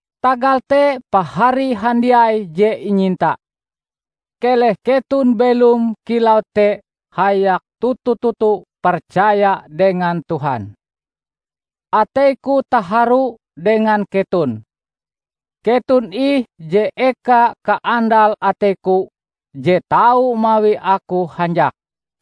Tagal te Pahari handiai je inyinta, keleh keton belom kilau te hayak toto-toto percaya dengan Tuhan. Ateiku taharu dengan keton! Keton ih je eka kaandal ateiku je tau mawi aku hanjak.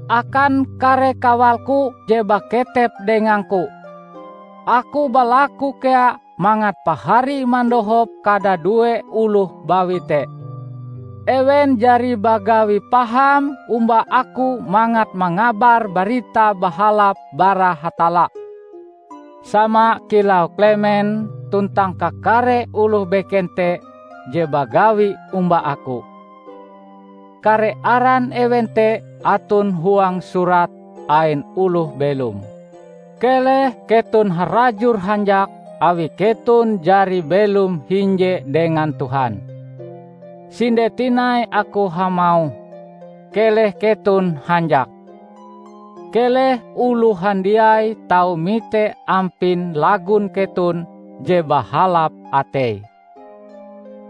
Akan kare kawalku je baketep dengangku, aku balaku kea mangat pahari mandohop kadadue oloh bawi te. Ewen jari bagawi paham omba aku mangat mangabar Barita Bahalap bara Hatalla; sama kilau Klemen tuntang kakare oloh beken te je bagawi omba aku. Kare aran ewen te aton huang Surat ain Oloh Belom. Keleh keton harajur hanjak awi keton jari belom hinje dengan Tuhan. Sinde tinai aku hamauh: keleh keton hanjak! Keleh oloh handiai tau mite ampin lagon keton je bahalap atei.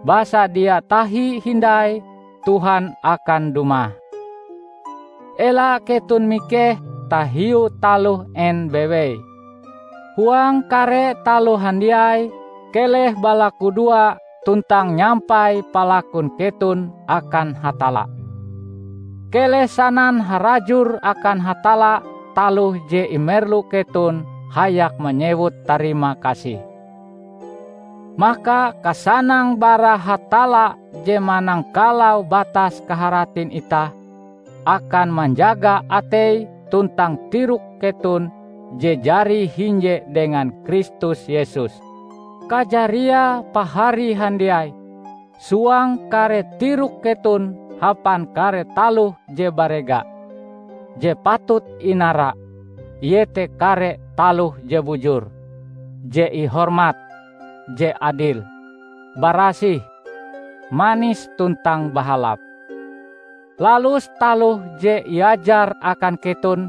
Basa dia tahi hindai Tuhan akan dumah. Ela keton mikeh tahiu taloh en bewei. Huang kare taloh handiai, keleh balakudoa tuntang nyampai palakun keton akan Hatalla. Keleh sanan harajur akan Hatalla taloh je imerlu keton hayak manyewut tarimakasih. Maka kasanang bara Hatalla je manangkalau batas kaharatin itah, akan manjaga atei tuntang tirok keton je jari hinje dengan Kristus Yesus. Kajariae, pahari handiai, suang kare tirok keton hapan kare taloh je barega, je patut inara, iete kare taloh je bujur, je ihormat, je adil, barasih, manis tuntang bahalap. Lalus taloh je iajar akan keton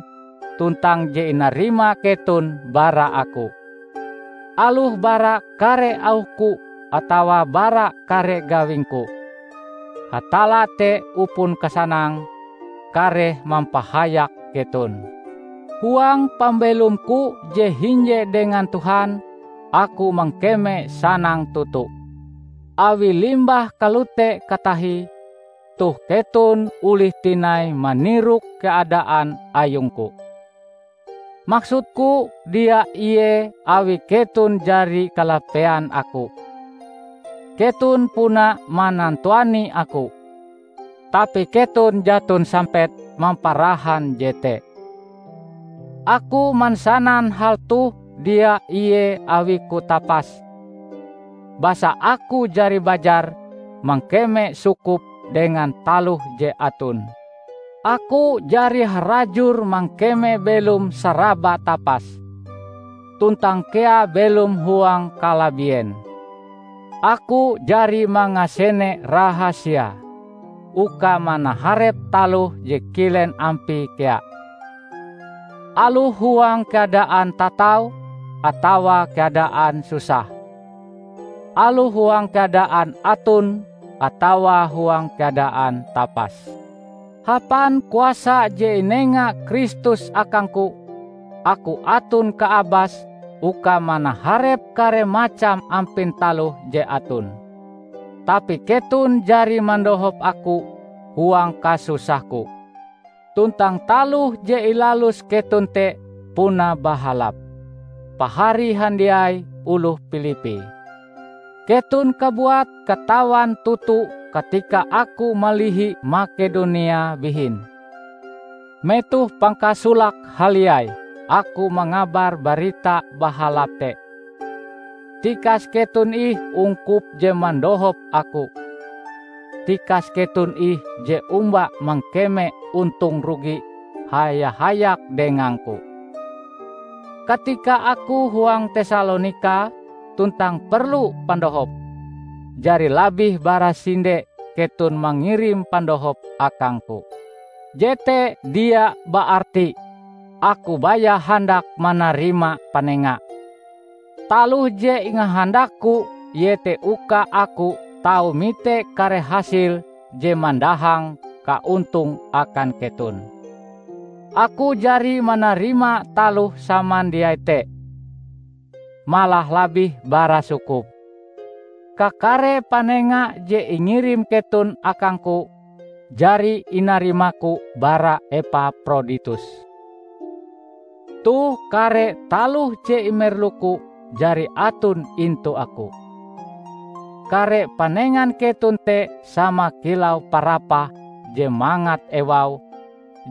tuntang je inarima keton bara aku; aloh bara kare auhku atawa bara kare gawingku. Hatalla te upon kasanang, kareh mampahayak keton. Huang pambelomku je hinje dengan Tuhan, aku mangkeme sanang toto, awi limbah kalote katahie, toh keton olih tinai manirok keadaan ayungku. Maksudku dia ie awi keton jari kalapean aku, keton puna manantuani aku, tapi keton jaton sampet mamparahan jete. Aku mansanan hal toh dia ie awiku tapas, basa aku jari bajar mangkeme sukup dengan taloh je aton. Aku jari harajur mangkeme belom saraba tapas, tuntang kea belom huang kalabien. Aku jari mangasene rahasiae uka manaharep taloh je kilen ampie kea; aloh huang keadaan tatau atawa keadaan susah, aloh huang keadaan aton atawa huang keadaan tapas. Hapan kuasa je inega Kristus akangku, aku aton kaabas uka manaharep kare macam ampin taloh je aton. Tapi keton jari mandohop aku huang kasusahku; tuntang taloh je ilalus keton te puna bahalap. Pahari handiai oloh Pilippi! Keton kabuat katawan toto katika aku malihi Makedonia bihin, metoh pangkasolake haliai aku mangabar Barita Bahalap te, tikas keton ih ungkup je mandohop aku; tikas keton ih je omba mangkeme ontong rugi haya-hayak dengangku. Katika aku huang Tesalonika tuntang perlu pandohop, jari labih bara sinde keton mangirim pandohop akangku. Jete dia baarti aku baya handak manarima panenga. Taloh je ingahandakku iete uka aku tau mite kare hasil je mandahang kaontong akan keton. Aku jari manarima taloh samandiai te -- malah labih bara sukup! Kakare panenga je ingirim keton akangku, jari inarimaku bara Epaproditus. Toh kare taloh je imerluku jari aton intu aku. Kare panengan keton te sama kilau parapah je mangat ewaue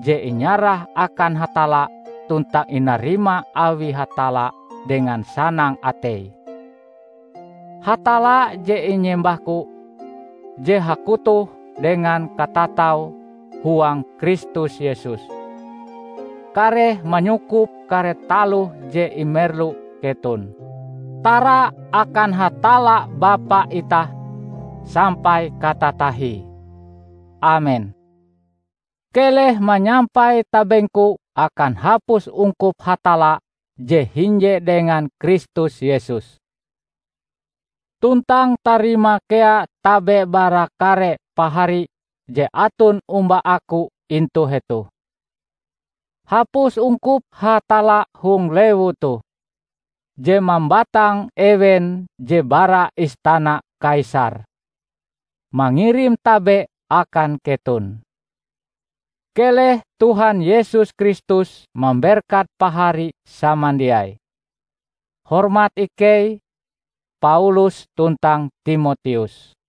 je inyarah akan Hatalla tuntang inarima awi Hatalla dengan sanang atei. Hatalla je inyembahku, je hakotoh dengan katatau huang Kristus Yesus, kareh manyukup kare taloh je imerlu keton. Tara akan Hatalla Bapa itah sampai katatahie! Amen. Keleh manyampai tabengku akan hapus ungkup Hatalla je hinje dengan Kristus Yesus. Tuntang tarima kea tabe bara kare pahari je aton omba aku intu hetoh. Hapus ungkup Hatalla hong lewu toh, je mambatang ewen je bara istana Kaisar, mangirim tabe akan keton. Keleh Tuhan Yesus Kristus mamberkat pahari samandiai. Hormat ikei, Paulus tuntang Timoteus